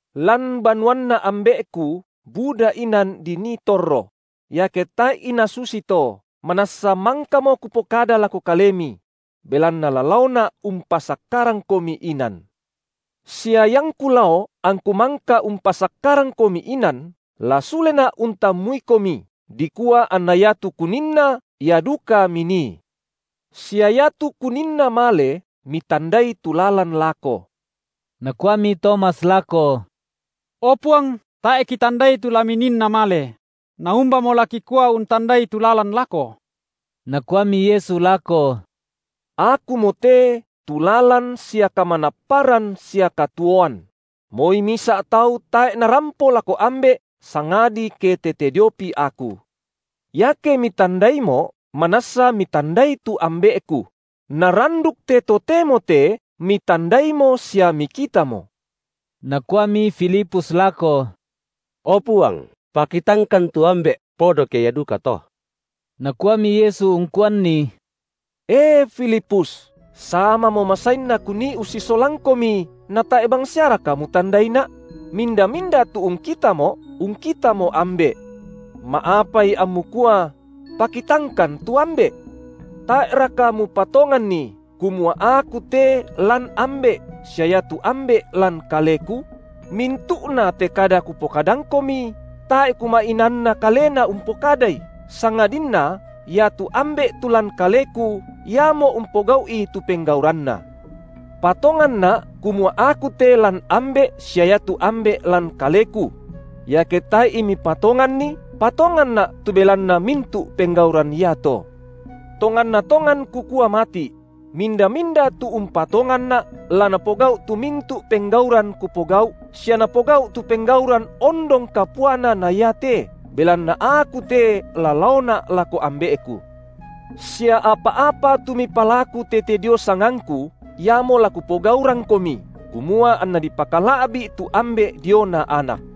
Lan banuanNa Ambe’Ku buda inan dinii torro; iake tae’i nasusi to, manassa mangkamo Kupokada lako kalemi; belanna la laoNa’ umpasakkarangkomi inan. Sia iangKu lao angKu mangka umpasakkarangkomi inan, la suleNa’ untammuikomi, dikua anna iatu Kuninna, ia duka minii. Sia iatu Kuninna male, mitandai tu lalan lako. Nakuami Tomas lako: O Puang, tae’ kitandai tu la Mininna male; na umbamo la kikua untandai tu lalan lako? Nakuami Yesu lako: Akumote tu lalan sia kamanapparan sia katuoan; moi misa’ tau tae’ narampo lako Ambe’ sangadi ke tete diopi Aku. Iake mitandaiMo’, manassa mitandai tu Ambe’Ku; na randuk te totemo te mitandaimo sia mikitamo. Nakuami Filipus lako: O Puang, pakitangkan tu Ambe’, podo ke ia dukato. Nakuami Yesu ungkuanni: E Filipus, samamo masainna Kunii ussisolangkomi, natae’ bangsiaraka mutandaiNa’? Minda-minda tu ungkitaMo’, ungkitamo Ambe’. Ma’apai ammu kua: Pakitangkan tu Ambe’? Tae’raka mupatonganni, kumua Aku te lan Ambe’ sia iatu Ambe’ lan Kaleku? Mintu’nate kada Kupokadangkomi, tae’ Kuma’inaanna kalena umpokadai, sangadinna iatu Ambe’ tu lan Kaleku, Iamo umpogau’i tu penggauranNa. PatonganNa’ kumua Aku te lan Ambe’ sia iatu Ambe’ lan Kaleku; iake tae’i mipatonganni, patonganNa’ tu belanna mintu’ penggauran iato. Tonganna tongan Kukua mati’: Minda-minda tu umpatonganNa’, la napogau’ tu mintu’ penggauran Kupogau’, sia napogau’ tu penggauran ondong kapuana na iate, belanna Aku te la laoNa’ lako Ambe’Ku. Sia apa-apa tu mipalaku tete dio sangangKu, iamo la Kupogaurangkomi, kumua anNa dipakala’bi’ tu Ambe’ diona Anak.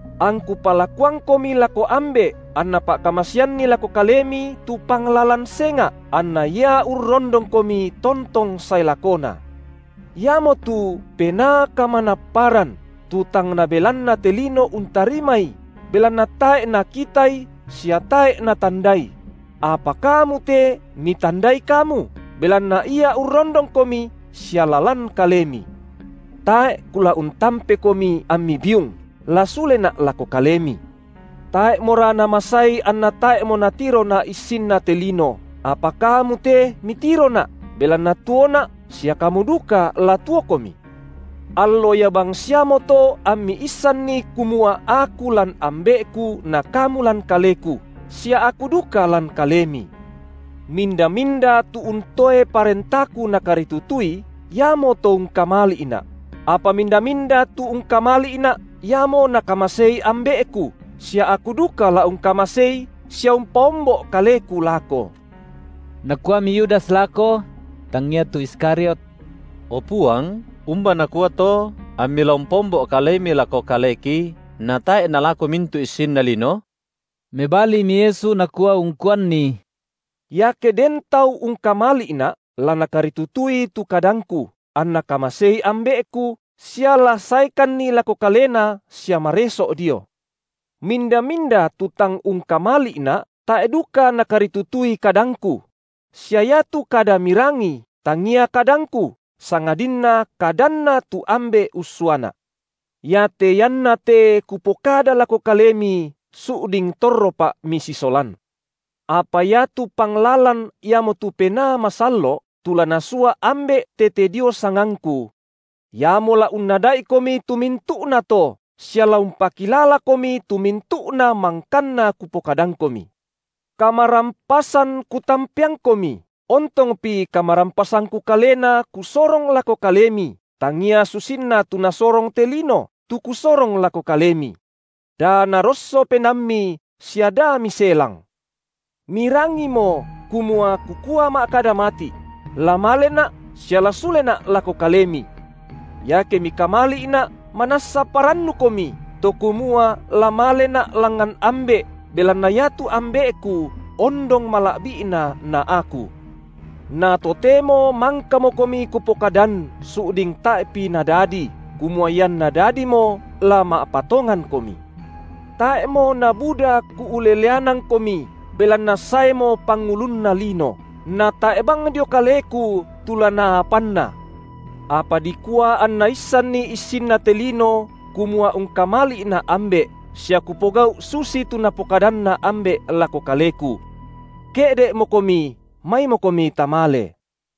AngKu palakuangkomi lako Ambe’, anNa pa’kamaseanNi lako kalemi tu Panglalan senga’, anna Ia urrondongkomi tontong sae lakona, Iamotu Penaa Kamanaparan, tu tang nabelanna te lino untarimaI, belanna tae’ nakitaI sia tae’ natandaI; apa kamu te mitandaI kamu, belanna Ia urrondongkomi, sia la lan kalemi. Tae’ Kula untampekomi ammi biung, la suleNa’ lako kalemi. Tae’mora namasai anna tae’mo natiroNa’ issinna te lino, apa kamu te mitiroNa’, belanna tuoNa’ sia kamu duka la tuokomi. Allo ia bangsiamoto ammi issanni kumua Aku lan Ambe’Ku na kamu lan Kaleku, sia Aku duka lan kalemi. Minda-minda tu untoe parentaKu nakaritutui, iamoto ungkamali’Na’; apa minda-minda tu ungkamali’Na’, iamo Nakamasei Ambe’Ku, sia Aku duka la ungkamasei sia umpaombo’ Kaleku lako. Nakuami Yudas lako – tangia tu Iskariot –: O Puang umba nakua to amMi la umpaombo’ Kalemi lako kaleki natae’ nalako mintu’ issinna lino? Mebalimi Yesu nakua ungkuanni: Iake den tau ungkamali’Na’, la nakaritutui tu kadangKu, anNa kamasei Ambe’Ku, sia la saeKanni lako kalena sia mareso’ dio. Minda-minda tu tang ungkamali’Na’, tae’ duka nakaritutui kadangKu; sia iatu kada mirangi, tangia kadangKu, sangadinna kadanNa tu Ambe’ ussuaNa’. Iate ianna te Kupokada lako kalemi su’ding torroPa’ misisolan. Apa iatu Panglalan iamotu Penaa Masallo’, tu la Nasua Ambe’ tete dio sangangKu. Iamo la unnada’ikomi tu mintu’nato sia la umpakilalakomi tu mintu’na mangkanna Kupokadangkomi. Kamarampasan Kutampeangkomi, ontongpi kamarampasangKu kalena Kusorong lako kalemi, tangia susinna tu nasorong te lino, tu Kusorong lako kalemi. Da narosso penaammi sia da miselang. Mirangimo kumua Kukua ma’kada mati’: La maleNa’ sia la suleNa’ lako kalemi. Iake mikamali’Na’, manassa parannukomi, to kumua la maleNa’ langngan Ambe’, belanna iatu Ambe’Ku ondong mala’bi’Na na Aku. Na totemo mangkakomi Kupokadan su’ding tae’pi nadadi, kumua ianna dadimo, la ma’patongankomi. Tae’mo nabuda Kuuleleanangkomi, belanna saemo pangulunna lino, natae’ bang dio Kaleku tu la naapanNa’. Apa dikua anna issanni issinna te lino kumua ungkamali’Na’ Ambe’, sia Kupogau’ susitu Napokadanna Ambe’ lako Kaleku. Ke’de’mokomi, maimokomi tamale.